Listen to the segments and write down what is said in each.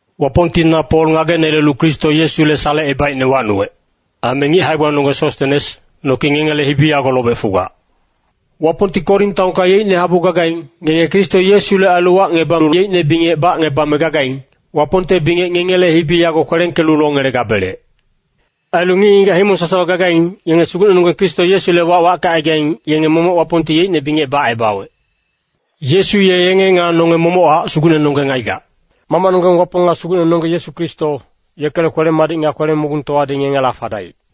Wapongti na Pol ngagenelelu Kristo Yesule salecebaicne wacnuwec, aime ngic hae-gbanonggeng Sostenes, noki ngengele hibi yago lobec fugac. Wapongti Korin taonka yeicne habu gagaing, ngenge Kristo Yesule ailu wacngebalu yeicne bingec bacngebame gagaing, Wapongte bingec ngengele hibi yago kwelengkelu longelegabelec. Ailu ngic-ngigac himong sasawa gagaing, yenge Sugucnenonggeng Kristo Yesule wac wackecaigaing, yenge momoc Wapongti yeicne bingec bacebawec. Yesu ye yenge nga nonge momochac Sugucnenonggeng aigac. Mamacnonggeng Wapong nga Sugucnenonggeng Yesu Kristo, yekele kwele-madic nga kwele-mogungtowadi ngengela fadaic.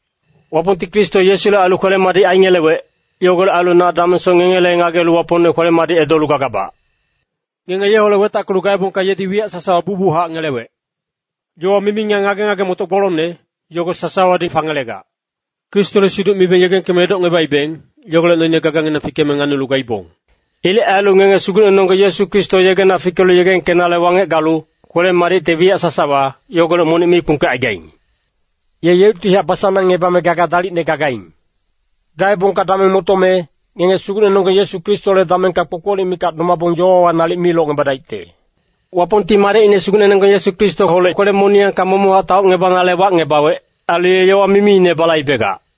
Wapongti Kristo Yesule ailu kwele-madic aingelewec. Yogolec ailu na damengsoc ngengele ngagelu Wapongne kwele-madic edolu gagabac. Ngenge yeholec wetackelu gaebongka yedi wiyac sasawa bucbuchac ngelewec. Yowa mimi nga ngage-ngage-motoc gbolongne, yogo sasawadi fangelegac. Kristole siduc mibeng yegengkeme edocngebaibeng, yogolec noine gaganginang fikeme nganilu gaibong. Ilec ailu ngenge Sugucnenonggeng Yesu Kristo yegena fikelu yegengkenale wangec galu, kwele-madicte wiyac sasawa, yogolec monic mi kpungkecaigaing. Ye yeuctihac basanangngebame gaga dalicne gagaing. Gaebongka dameng motome, ngenge Sugucnenonggeng Yesu Kristole damengka kpokpolic mikac domabong yowawa nalic mi locngebadaicte. Wapongti Madecine Sugucnenonggeng Yesu Kristoholec kwele-moniyangka momochac taocngebanale wacngebawec. Ailu ye yowa mimiine balaibegac.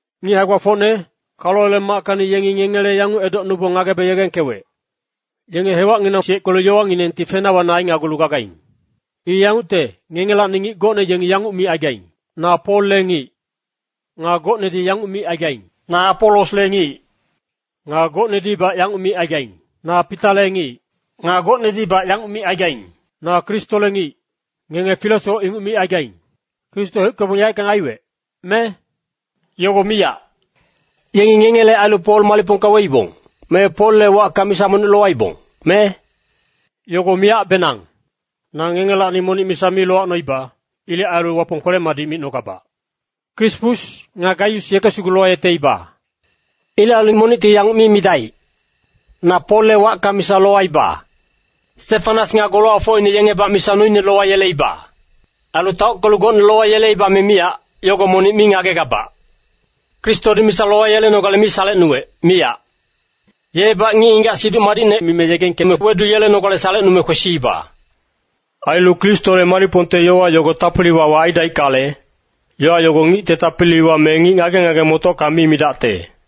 Ngic hae-gbafocne, Kaloele mackacni yengi ngengele yanguc edocnubong ngagebe yegengkewec, “Yenge hewacnginang siyeckelu yowanginengti fena wana ainagulu gagaing.” I yangucte, ngengelacni ngic gocne yengi yanguc micaigaing, “Na Polle ngic.” Nga gocnedi yanguc micaigaing, “Na Apolosle ngic.” Nga gocnedibac yanguc micaigaing, “Na Pitale ngic.” Nga gocnedibac yanguc micaigaing, “Na Kristole ngic.” Ngenge filesoc inguc micaigaing. Kristo heuckebong yaeckang aiwec, me? Yogo miyac! Yengi ngengele ailu Pol malicpongka weibong, me Polle wacka misa monic lowangeleibong, me? Yogo miyacbenang. Na ngengelacni monic misa mi lowacnoiba. Ilec ailu Wapong kwele-madic micnogabac. Krispus, nga Gaius yeke sugu lowayeteiba. Ilec ailu monicti yanguc mi midaic, “Na Polle wacka misa lowaiba.” (Stefanas nga golowacfocine yengebac misa noine lowayeleiba. Ailu taockelu gocne lowayeleiba me miyac, yogo monic mi ngagegabac.) Kristodi misa lowayelenogale mi salecnuwec, miyac. Yebac ngic-ngigac Siduc Madicne mime yegengkeme weduyelenogale salecnume kwesiiba. Ailu Kristole malicpongte yowa yogo tapili-wawa aidaickale, yowa yogo ngicte tapiliwa me ngic ngage-ngage-motocka mi midacte.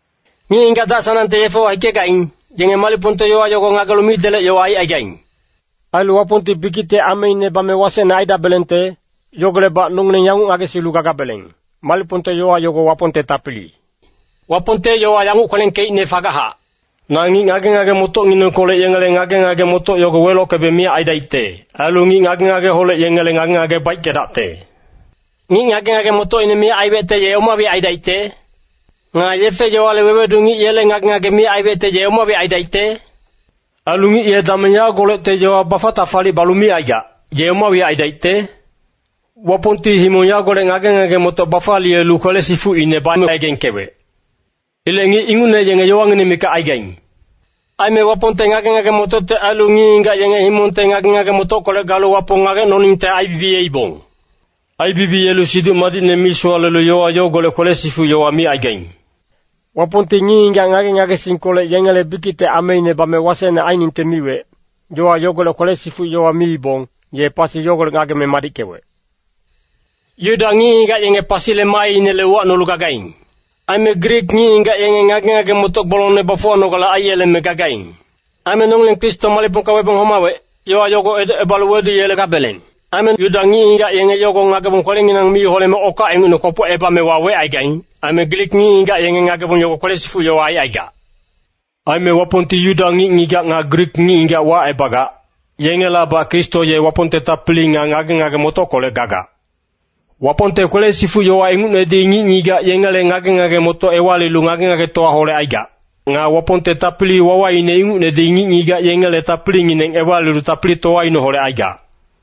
Ngic-ngigac dac-sanangte yefewa hikegaing, yenge malicpongte yowa yogo ngagelu midelec yowa aicaigaing. Ailu Wapongti bikicte ameine bame wasecne aidabelengte, yogolecbac nongileng yanguc ngagesilu gagabeleng, malicpongte yowa yogo Wapongte tapili. Wapongte yowa yanguc kwelengkeicne fagachac, “Na ngic ngage-ngage-motocnginengkolec yengele ngage-ngage-motoc yogo welockebe miyac aidaicte. Ailu ngic ngage-ngageholec yengele ngage-ngage baickedacte.” Ngic ngage-ngage-motocine miyac aiwecte ye oma wiyac aidaicte? Nga yefe-yowale wewedu ngic yele ngage-ngage miyac aiwecte ye oma wiyac aidaicte? Ailu ngic ye dameng yagolecte yowa bafac-tafalic balu micaigac, ye oma wiyac aidaicte? Wapongti himong yagolec ngage-ngage-motoc bafaliyelu kwele-sifucine bame yegengkewec. Ilec ngic ingucne yenge yowangineng mikac aigaing. Aime Wapongte ngage-ngage-motocte ailu ngic-ngigac yenge himongte ngage-ngage-motockolec galu Wapong ngagecnoningte aibibiyeibong. Aibibiyelu Siduc Madicne misowalelu yowa yogolec kwele-sifuc yowa micaigaing. Wapongti ngic-ngigac ngage-ngagesingkolec yengele bikicte ameine bame wasecne ainingte miwec, yowa yogolec kwele-sifuc yowa miibong, ye pasi yogolec ngageme madickewec. Yuda ngic-ngigac yenge pasile maainele uwacnolu gagaing. Aime Grik ngic-ngigac yenge ngage-ngage-motoc gbolongne bafuwanogale aiyeleme gagaing. Aime nongileng Kristo malicpongka webong homawec, yowa yogo edocebalu weduyelegabeleng. Aime Yuda ngic-ngigac yenge yogo ngagebong kwelenginang mi holeme okac ingucne kwopocebame wawecaigaing. Aime Grik ngic-ngigac yengi ngagebong yogo kwele-sifuc yowa aicaigac. Aime Wapongti Yuda ngic-ngigac nga Grik ngic-ngigac wacebagac, yengelabac Kristo ye Wapongte tapili nga ngage-ngage-motockolec gagac. Wapongte kwele-sifuc yowa ingucnedi ngic-ngigac yengele ngage-ngage-motoc ewalilu ngage-ngagetowaholec aigac. Nga Wapongte tapili-wawaine ingucnedi ngic-ngigac yengele tapilingineng ewalilu tapilitowaineholec aigac.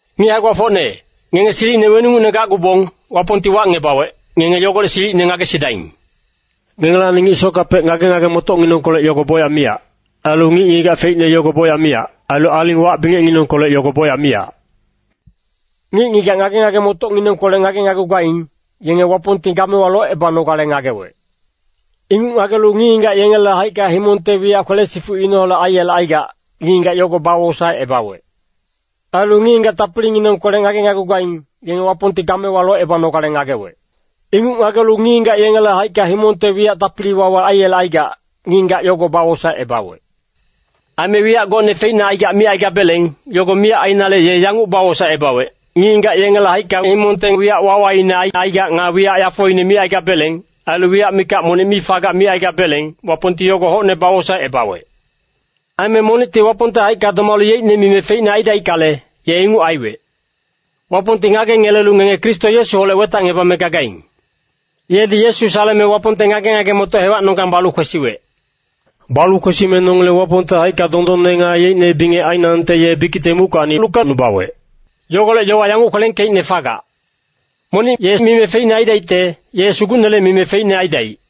Ngic hae-gbafocne, ngenge silicine weningucne gacgubong, Wapongti wacngebawec, ngenge yogolec silicine ngagesidaing. Ngengelacni ngic sockapec ngage-ngage-motocnginengkolec yogo bocyac miyac. Ailu ngic-ngigac feicne yogo bocyac miyac. Ailu aling wac bingecnginengkolec yogo bocyac miyac. Ngic-ngigac ngage-ngage-motocnginengkolec ngagenagugaing, yenge Wapongti gamewa locebanogale ngagewec. Inguc ngagelu ngic-ngigac yengele haicka himongte wiyac kwele-sifucineholec aiyelecaigac, ngic-ngigac yogo bawosaecebawec. Ailu ngic-ngigac tapilinginengkolec ngagenagugaing, yenge Wapongti gamewa locebanogale ngagewec. Inguc ngagelu ngic-ngigac yengele haicka himongte wiyac tapili-wawa aiyelecaigac, ngic-ngigac yogo bawosaecebawec. Aime wiyac gocne feicne aigac micaigabeleng, yogo miyac ainale ye yanguc bawosaecebawec. Ngic-ngigac yengele haicka himongte wiyac wawaine aicaigac, nga wiyac yafoine micaigabeleng, ailu wiyac mikac monic mi fagac micaigabeleng, Wapongti yogo hocne bawosaecebawec. Aime monicti Wapongte haicka domalu yeicnele mime feicne aidaickale, ye inguc aiwec. Wapongti ngagengelelu ngenge Kristo Yesuholec wetacngebame gagaing. Yedi Yesu saleme Wapongte ngage-ngage-motoc hewacnonggang balu kwesiwec. Balu kwesime nongileng Wapongte haicka dondonne nga yeicne bingec ainangte ye bikicte muckacni lukecnubawec. Yogolec yowa yanguc kwelengkeicne fagac, “Monic ye mime feicne aidaicte, ye Sugucnele mime feicne aidaic.”